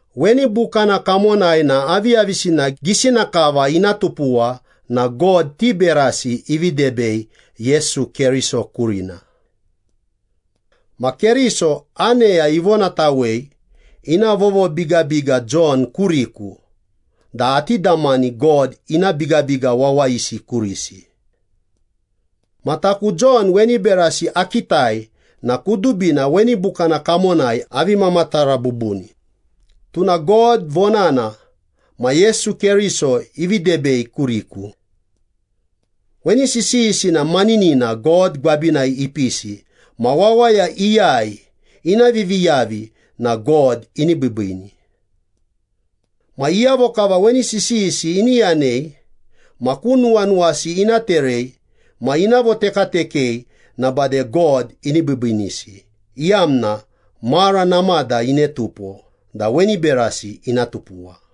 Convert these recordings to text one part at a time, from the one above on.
Weni bukana kamonai na aviyavisina gisina kava ina tupuwa na God ti berasi ivi debei Yesu Keriso kurina. Ma Keriso, aneya ivonatawei ina vovobigabiga Jon kuriku da ati damani God ina bigabiga wawayisi kurisi. Ma taku Jon weni berasi akitai na kudubina weni bukana kamonai avi mamatara bubuni, tuna God vonana ma Yesu Keriso ivi debei kuriku. Weni sisiyisi na maninina God gwabinai ipisi ma wawaya iyai ina viviyavi na God ini biibiini. Ma iyavo kava weni sisiyisi ini yanei ma ku nuwanuwasi ina terei ma ina votekatekei na bade God ini biibiinisi, iyamna mara namada ine tupo da weni berasi ina tupuwa.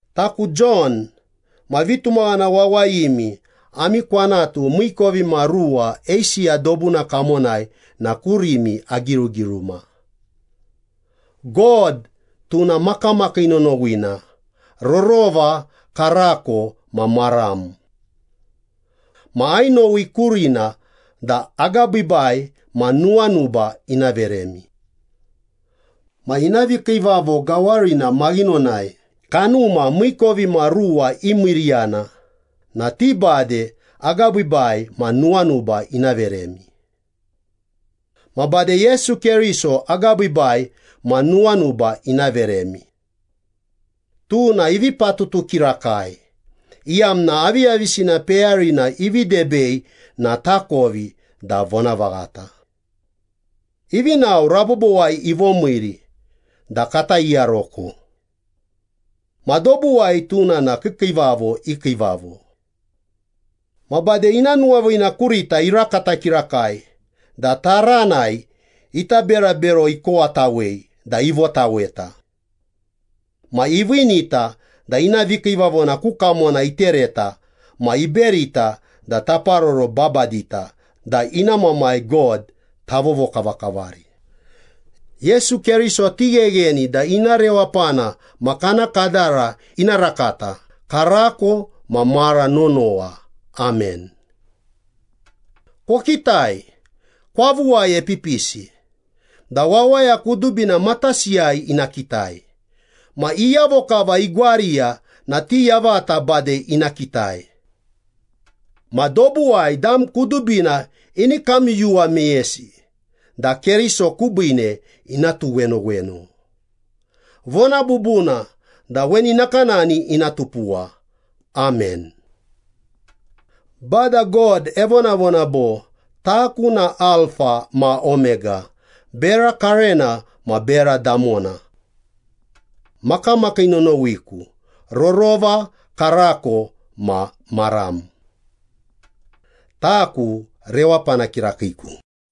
Taku Jon, ma vitumaghana wawayimi ami kwanatu miikovimaruwa Eisiya dobuna kamonai na kurimi agirugiruma. God, tuna makamakii nonowina, rorova, karako, ma maram. Ma ainowi kurina da agabiibai ma nuwanuba ina veremi. Ma ina vikiivavo gawarina maghinonai kanuma miikovimaruwa imiiriyana na ti bade agabiibai ma nuwanuba ina veremi. Ma bade Yesu Keriso agabiibai ma nuwanuba ina veremi. Tuna ivi patutu kirakai, iyamna aviyavisina peyarina ivi debei na takovi da vonavaghata. Ivi nao, rabobowai ivomiiri da kata iyaroko. Ma dobuwai tuna na kiikiivavo i Kiivavo. Ma bade ina nuwaviina kurita irakata kirakai da taranai ita berabero ikowatawei da ivotaweta. Ma iviinita da ina vikiivavona ku kamona itereta ma iberita da taparoro babadita da ina Mamai God tavovokavakavari. Yesu Keriso tighegheni da ina rewapana ma kana kadara ina rakata, karako ma mara nonowa. Amen. Kokitai! Kwavuwai epipisi, da wawaya kudubina matasiyai ina kitai, ma iyavo kava igwariya na ti yavata bade ina kitai. Ma dobuwai dam kudubina ini kamyuyuwa meyesi da Keriso kubiine ina tuwenoweno. Vona bubuna da weni nakanani ina tupuwa. Amen. Bada God evonavona bo, “Taku na Alfa ma Omega, bera karena ma bera damona. Makamakii nonowiku, rorova, karako ma maram. Taku rewapana kirakiiku.”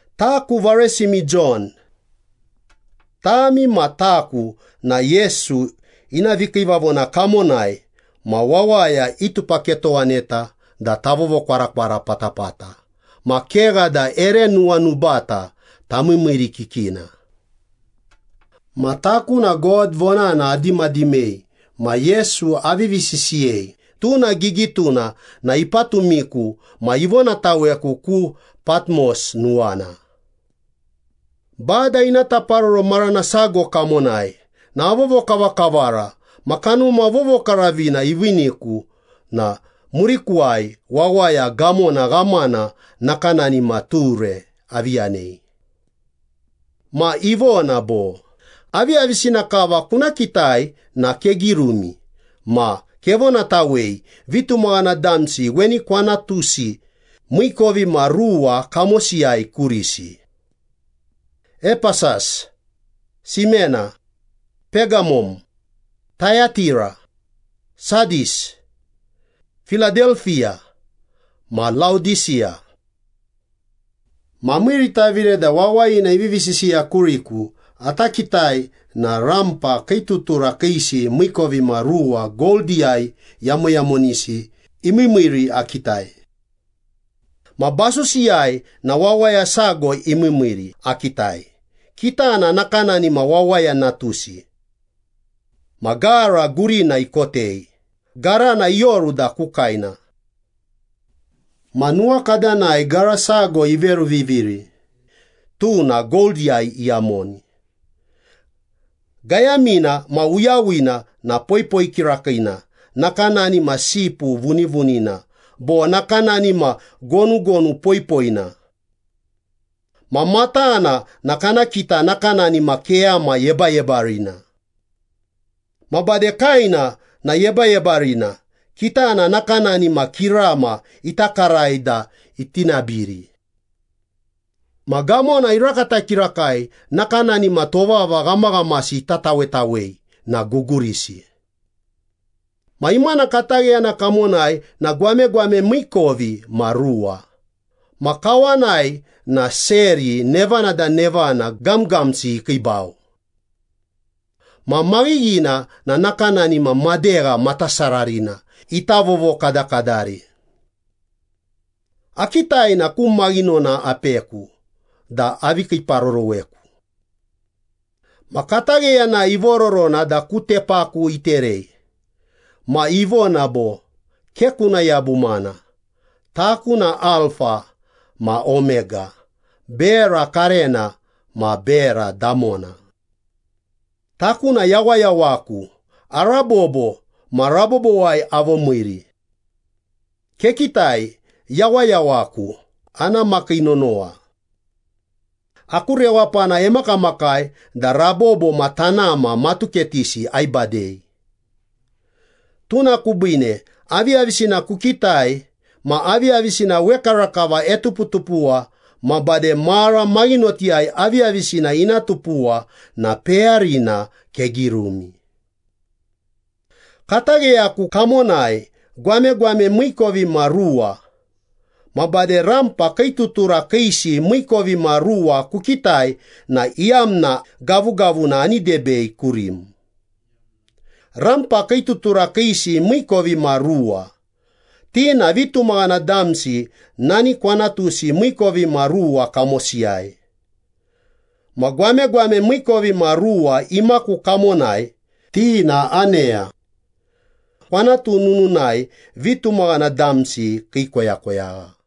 Taku varesimi Jon. Tami ma taku na Yesu ina vikiivavona kamonai ma wawaya itupaketowaneta da tavovokwarakwara patapata ma kegha da ere nuwanubata tamiimiirikikina. Ma taku na God vonana adimadimei ma Yesu avivi sisiyei tuna gigituna na ipatumiku ma ivonataweku ku Patmos nuwana. Bada ina taparoro marana sago kamonai na avovokavakavara ma Kanuma Vovokaravina iviiniku na murikuwai wawaya gamona ghamana nakanani ma ture avi yanei. Ma ivona bo, “Aviyavisina kava kuna kitai na kegirumi ma kevonatawei vitumaghana damsi weni kwanatusi miikovimaruwa kamosiyai kurisi. Epesas, Simena, Pegamom, Tayatira, Sadis, Piladelpiya, ma Laodisiya.” Ma amiiritavire da wawayina ivivi sisiya kuriku ata kitai na rampa kii tutura kiisi miikovimaruwa goldiyai yamoyamonisi imiimiiri akitai. Ma basusiyai na wawaya sago imiimiiri akitai, kitana nakanani ma Wawaya Natusi. Ma gara gurina ikotei, garana ioru da ku kaena. Ma nuwakadanai gara sago iveruviviri, tuna goldiyai iyamoni. Gayamina ma uyawina na poipoi kirakiina nakanani ma sipu vunivunina bo nakanani ma gonugonu poipoina. Ma matana na kana kita nakanani ma keyama yebayebarina. Ma bade kaena na yebayebarina, kitana nakanani ma kirama ita karai da iti nabiri. Ma gamona irakata kirakai nakanani ma tovava ghamaghamasi ita tawetawei na gugurisi. Ma imana katagheyana kamonai na gwamegwame miikovimaruwa, ma kawanai na seri nevana da nevana gamgamsi ikiibau. Ma maghighina na nakanani ma madegha matasararina ita vovokadakadari. Akitai na ku maghinona apeku da avi kiiparoroweku. Ma katagheyanai ivororona da ku tepaku iterei ma ivona bo, “Ke kuna yabumana. Taku na Alfa ma Omega, bera karena ma bera damona.” “Taku na yawayawaku, arabobo ma rabobowai avomiiri. Kekitai, yawayawaku ana makii nonowa. Aku rewapana emakamakai da rabobo ma tanama matuketisi aibadei.” “Tuna kubiine, aviyavisina kukitai, ma aviyavisina wekarakava etuputupuwa ma bade mara maghinotiyai aviyavisina ina tupuwa na peyarina kegirumi. Katagheyaku kamonai gwamegwame miikovimaruwa ma bade rampa kii tutura kiisi miikovimaruwa kukitai na iyamna gavugavuna ani debei kurim. Rampa kii tutura kiisi miikovimaruwa, ti na vitumaghana damsi nani kwanatusi miikovimaruwa kamosiyai. Ma gwamegwame miikovimaruwa imaku kamonai, ti na aneya. Kwanatu nununai vitumaghana damsi kii koyakoyagha.”